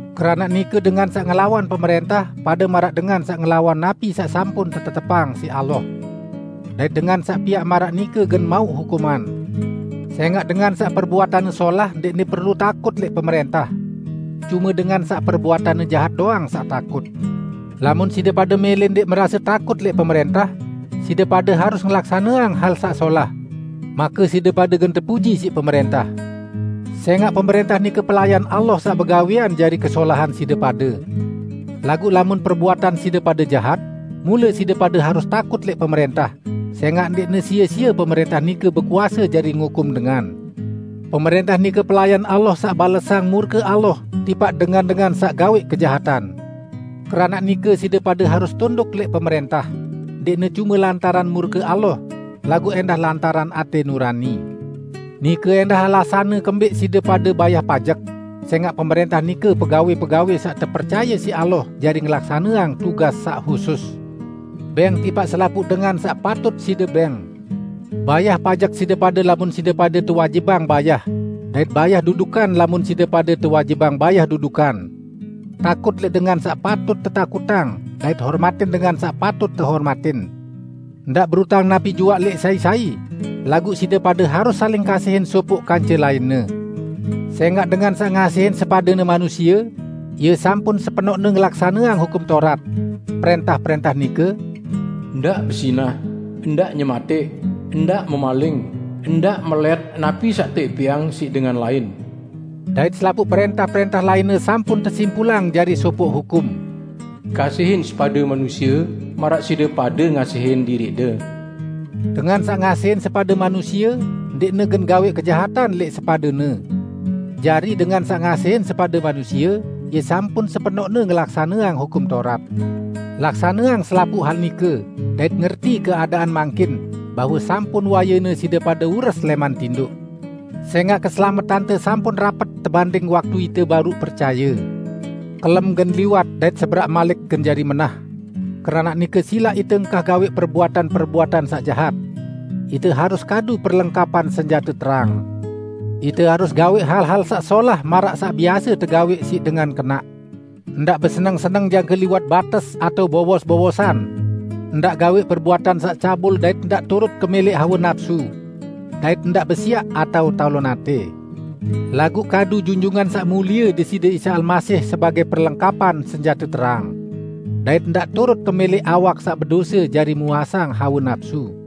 Keranaq nike dengan saq ngelawan pemrẽntah pade maraq dengan saq ngelawan napi saq sampun tetetepang siq Allah. Dait dengan saq piaq maraq nike gen mauq hukuman. Sẽngaq dengan saq perbuatanne solah ndẽqne perlu takut lẽq pemrẽntah. Cume dengan saq perbuatanne jahat doang saq takut. Lamun side pade mẽlẽ ndẽq merase takut lẽq pemrẽntah, side pade harus ngelaksaneang hal saq solah, make side pade gen tepuji siq pemrẽntah. Sẽngaq pemrẽntah nike pelayan Allah saq begawẽan jari kesolahan side pade. Laguq lamun perbuatan side pade jahat, mule side pade harus takut lẽq pemrẽntah sẽngaq ndẽqne sie-sie pemrẽntah nike bekuase jari ngukum dengan. Pemrẽntah nike pelayan Allah saq balesang murke Allah tipaq dengan-dengan saq gawẽq kejahatan. Keranaq nike side pade harus tunduk lẽq pemrẽntah -- ndẽqne cume lantaran murke Allah, laguq ẽndah lantaran atẽ nurani. Nike ẽndah alasanne kembẽq side pade bayah pajek, sẽngaq pemrẽntah nike pegawẽ-pegawẽ saq tepercaye siq Allah jari ngelaksaneang tugas saq husus. Bẽng tipaq selapuq dengan saq patut side bẽng: Bayah pajek side pade lamun side pade tewajibang bayah, dait bayah dudukan lamun side pade tewajibang bayah dudukan. Takut lẽq dengan saq patut tetakutang dait hormatin dengan saq patut tehormatin. Ndaq berutang napi juaq lẽq sai-sai, laguq side pade harus saling kasihin sopoq kance lainne. Sẽngaq dengan saq ngasihin sepadene manusie, ie sampun sepenoqne ngelaksaneang Hukum Taurat. Prẽntah-prẽntah nike: Ndaq bezinah, ndaq nyematẽq, ndaq memaling, ndaq melẽt napi saq teẽpẽang siq dengan lain; dait selapuq prẽntah-prẽntah lainne sampun tesimpulang jari sopoq hukum, "Kasihin sepadende manusie maraq side pade ngasihin diriqde." Dengan saq ngasihin sepade manusie ndẽqne gen gawẽq kejahatan lẽq sepadene. Jari dengan saq ngasihin sepade manusie, ie sampun sepenoqne ngelaksaneang Hukum Taurat. Laksaneang selapuq hal nike, dait ngerti keadaan mangkin, bahwe sampun wayene side pade ures lẽman tindoq. Sẽngaq keselametante sampun rapet tebanding waktu ite baruq percaye. Kelem gen liwat dait seberaq malik gen jari menah. Keranaq nike silaq ite engkah gawẽq perbuatan-perbuatan saq jahat. Ite harus kadu perlengkapan senjate terang. Ite harus gawẽq hal-hal saq solah maraq saq biase tegawẽq siq dengan kenaq; ndaq beseneng-seneng jangke liwat bates atao, bowos-bowosan. Ndaq gawẽq perbuatan saq cabul dait ndaq turut kemẽlẽq hawe napsu. Dait ndaq besiaq atao talon atẽ. Laguq kadu Junjungan Saq Mulie Deside Isa Almasih sebagẽ perlengkapan senjate terang. Dait ndaq turut kemẽlẽq awak saq bedose jari muasang hawe napsu.